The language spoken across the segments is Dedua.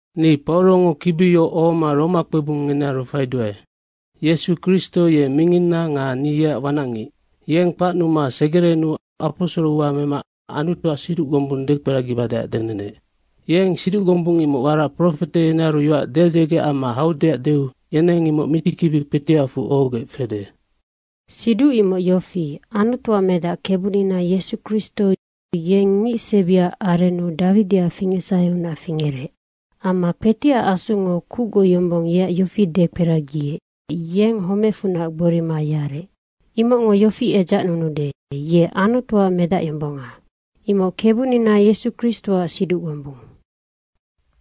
Ni Paurongo kibi yoc ohoma Roma kpebung ngenearu faiduae. Yesu Kristo ye minginna nga ni yeac wanacngic. Yeng kpacnuma segerenuu aposoro ua mema Anutuac siduc gombung dekperagibadeac denenec. Yeng siduc gombung imocnoc warac profete yenearu yoac dedzege amma haudeac deu yeneng imoc mitikibi kpetiacfu ohogec fede. Siduc imoc yofi, Anutuac Medac, Kebunina Yesu Kristo, yeng ngicsebiac arennu Dawidiac fingecsaheunac fingerec amma kpetiac Asungo kucgoc yombong yeac yofi dekperagiec, yennoc homecfunac gborima yarec, imocngo yofi edzacnunude, ye Anutuac Medacyombonga. Imoc Kebunina Yesu Kristoac siduc gombung.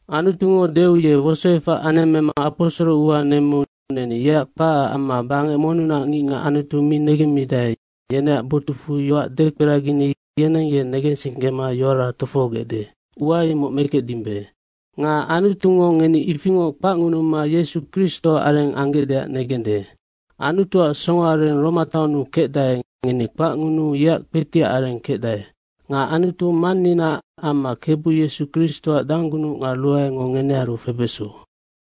Anutungo deu ye wosoefac anemmema aposoro ua nemmeu neni yeac kpacac amma bangec monnunac ngicngac Anutu mi negemmidae, yeneac botucfu yoac dekperagini yeneng ye negensinggema yoara tofohogecde, ua imoc mekecdimbe. Nga Anutungo ngeni ifingoc kpacngunuma Yesu Kristoac areng anggecdeac negende. Anutuac songoareng Roma taonnu kecdae, ngeni kpacngunuu yeac kpetiac areng kecdae. Nga Anutu Manninaac amma Kebu Yesu Kristoac danggunuc nga ruaengo ngenearu febeso.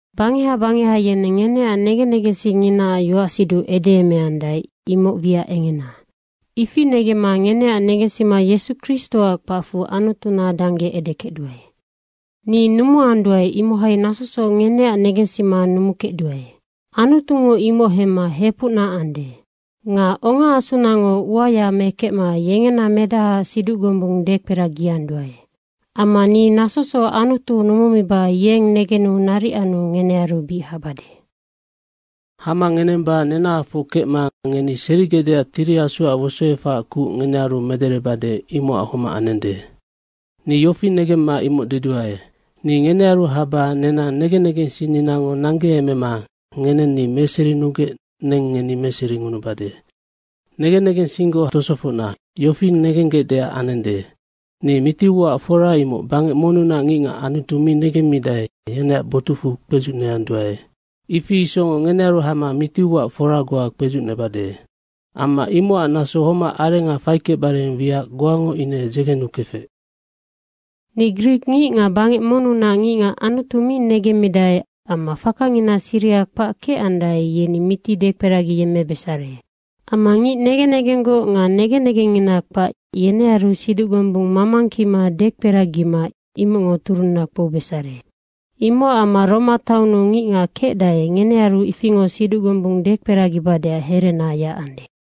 Bangeha bangeha yeneng ngeneac negen negensingnginaac yoacsiduc edeemeandae, imoc wiac engena ifi negemma ngeneac negensima Yesu Kristoac kpacfu Anutuna dangge edekecduae. Ni numuanduae, imohai nasosoc ngeneac negensima numukecduae. Anutungo imoc hemma hepucna ande. Nga ongaasunango uaya mekecma yengena Medahaac siduc gombung dekperagianduae. Amma ni nasosoc Anutu numumiba yeng negenu naric anu ngenearu bic habade. Hama ngenemba nenahafoc kecma ngeni serigecdeac Tiri Asuac wosoefacac kuc ngenearu mederebade, imocac homac anende. Ni yofi negemma imoc deduae, ni ngenearu haba nenang negen negensinninango nanggeemema ngeneng ni meserinugec neng ngeni meseringunubade. Negen negensinggoc tosofocna, yofi negenggecdeac anende. Ni miti uaac fora imoc bangec monnunac ngicngac Anutu mi negemmidae, yeneac botucfu kpedzucneanduae, ifi isocngoc ngenearu hama miti uaac fora goa kpedzucnebade. Amma imocac naso homac arenga faikecbare wiac goango ine dzegenukefec. Ni grikngic nga bangec monnunac ngicngac Anutu mi negemmidae amma fakangina siriha kpac kecandae, yeni miti dekperagiyemmebesare. Amma ngic negen negenggoc nga negen negengina kpac, yenearu siduc gombung mamangkima dekperagima imocngo turunna kpoubesare. Imocac amma Roma taonnu ngicngac kecdae, ngenearu ifingoc siduc gombung dekperagibadeac herena yacande.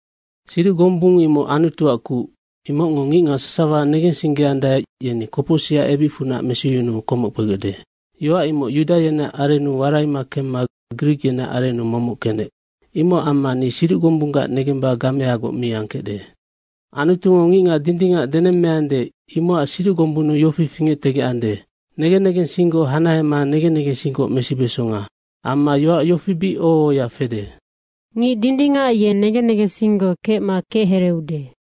Siduc gombung imoc Anutuac kuc. Imocngo ngicngac sasawa negensinggeandae, yeni kopocsicac ebicfunac mesiyunuu komoc kpegecde. Yoac imoc yuda yeneac arennu waraima kemma grik yeneac arennu momoc kenec. Imocac amma ni siduc gombunggac negemba gameagoc mi angkecde. Anutungo ngicngac dindingac denemmeande, imocac siduc gombunnu yofi fingectegecande, negen negensinggoc hanahema negen negensinggoc mesibesonga. Amma yoac yofi bic oho ohoya fede, “Ngic dindingac ye negen negensinggoc kecma kechereeude.”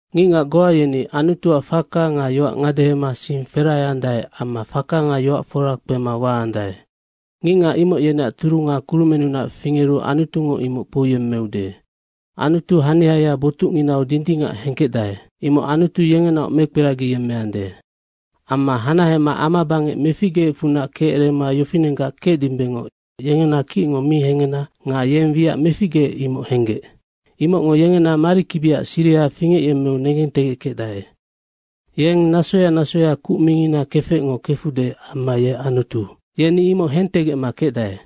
Ngicngac goa yeni Anutuac faka nga yoac ngadehema sing ferahaandae amma faka nga yoac fora kpema waandae. Ngicngac imoc yeneac turunga kurumenunac fingeru Anutungo imoc kpouyemmeude. Anutu haniaya botucnginau dindingac hengkecdae. Imocnoc Anutu yengenaoc mekperagiyemmeande. Amma hanahema ama bangec meficgeecfunac kecerema yofinenggac kecdimbengoc yengena kicngo mi hengena nga yeng wiac meficgeec, imoc henggec. Imocngo yengena marikibiaac siriha fingecyemmeu negentegeckecdae. Yeng nasoya nasoya kuc mingina kefecngo kefude amma ye Anutu, yeni imoc hentegecma kecdae.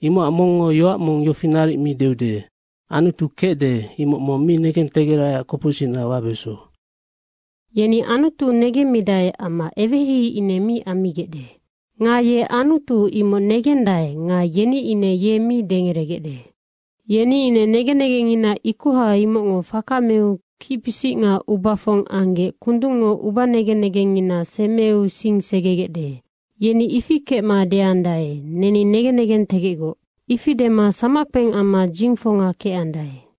Imocac mongngo yoac mong yofi naric mi deude, “Anutu kecde, imoc mong mi negentegeraiac kopocsicna wabeso.” Yeni Anutu negemmidae, amma eweheihei ine mi ammigecde. Nga ye Anutu, imoc negendaenoc nga yeni ine ye mi dengeregecde. Yeni ine negen negengngina ikoha, imocngo faka meu kicpisic nga ubafong anggec kundungngo ubanegen negengngina semeu sing segegecde. Yeni ifi kecma deandae, “Neni negen negentegecgoc.” ifi dema samackpeng amma dzingfonga kecandae.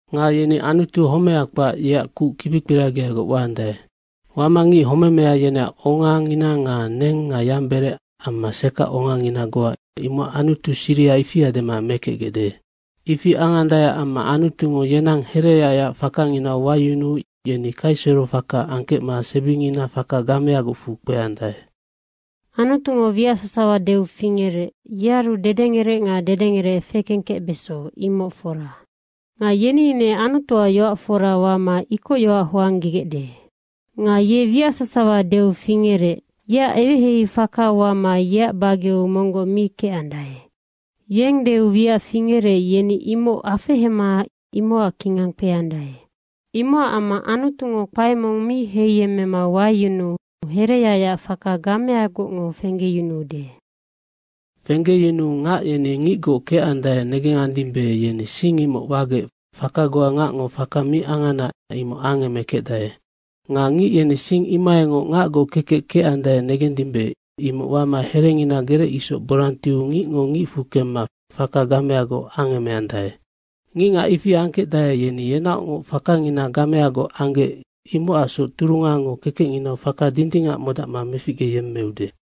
Nga yeni Anutu homeha kpac, yeac kuc kibikperagiagoc wama ngic homemea, yeneac ongangina nga neng nga yamberec amma sekac ongangina goa imocac Anutu siriha, ifia dema mekecgecde. Ifi angandaeac amma Anutungo yenang hereyacyac fakanginau wayunuu yeni kaiserofaka angkecma sebingina faka gameagocfu kpeandae. Anutungo wiac sasawa deu fingerec, yearu dedengerec nga dedengerec fekengkecbeso, imoc fora. Nga yeni ine Anutuac yoac fora wama ikocyoac hoanggegecde. Nga ye wiac sasawa deu fingerec, yeac eweheihei faka wama yeac bageu monggoc mi kecandae. Yeng deu wiac fingerec, yeni imoc afehema imocac kingang kpeandae. Imocac amma Anutungo kpae mong mi heiyemmema wayunuu hereyacyac faka gameagocngo fenggeyunuu ngac yeni ngicgoc kecandae negengandimbe, yeni sing imoc wagec faka goa ngacngo faka mi angana, imoc angemekecdae. Nga ngic yeni sing imohaingoc ngacgoc kekec kecandae negendimbe, imoc wama herengina gerec isoc borang tiu ngicngo ngicfu kemma faka gameagoc angemeandae. Ngicngac ifi angkecdae, yeni yenaocngoc fakangina gameagoc anggec, imocacsoc turungango kekecnginau faka dindingac modacma meficgeyemmeude.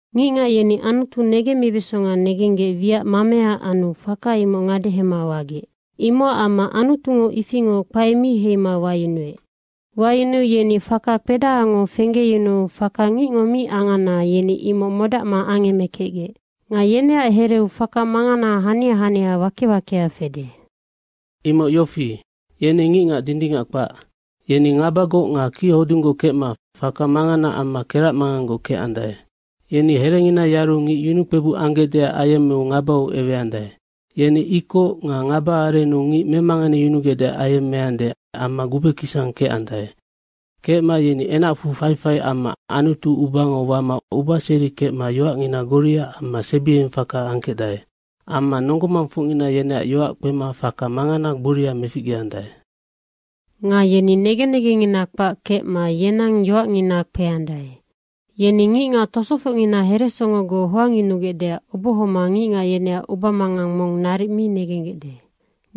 Ngicngac yeni Anutu negemmibesonga negenggec wiac mamea anu faka imoc ngadehema wagec. Imocac amma Anutungo ifingoc kpae mi heima wayunuec. Wayunuu yeni faka kpedahango fenggeyunuu faka ngicngo mi angana, yeni imoc modacma angemekecgec. Nga yeneac hereu faka mangana hania hania wake wakea fede, imoc yofi, yeni ngicngac dindingac kpac. Yeni ngabagoc nga kichodunggoc kecma faka mangana amma keracmanganggoc kecandae. Yeni herengina yaru ngic yunukpebuc anggecdeac ayemmeu ngabau eweandae. Yeni ikoc nga ngaba arennu ngic memanganeyunugecdeac ayemmeande amma gubekisang kecandae. Kecma yeni enacfu faifai amma Anutu ubango wama ubaseri kecma yoacngina goria amma sebiengeng faka angkecdae. Amma nonggo mangfocngina yeneac yoac kpema faka mangana gboria meficgeandae. Nga yeni negen negengngina kpac kecma yenang yoacngina kpeandae. Yeni ngicngac tosofocngina heresongogoc hoangyunugecdeac obohoma ngicngac yeneac ubamangang mong naric mi negenggecde.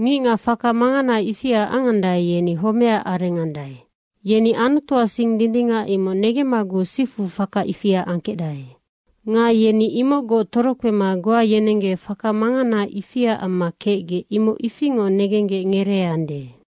Ngicngac faka mangana ifia angandae, yeni homecac areng andae. Yeni Anutuac sing dindingac imoc negemmaguc sifu faka ifia angkecdae. Nga yeni imocgoc torokpema goa yenenggec faka mangana ifia amma kecgec, imoc ifingoc negenggec ngereeande.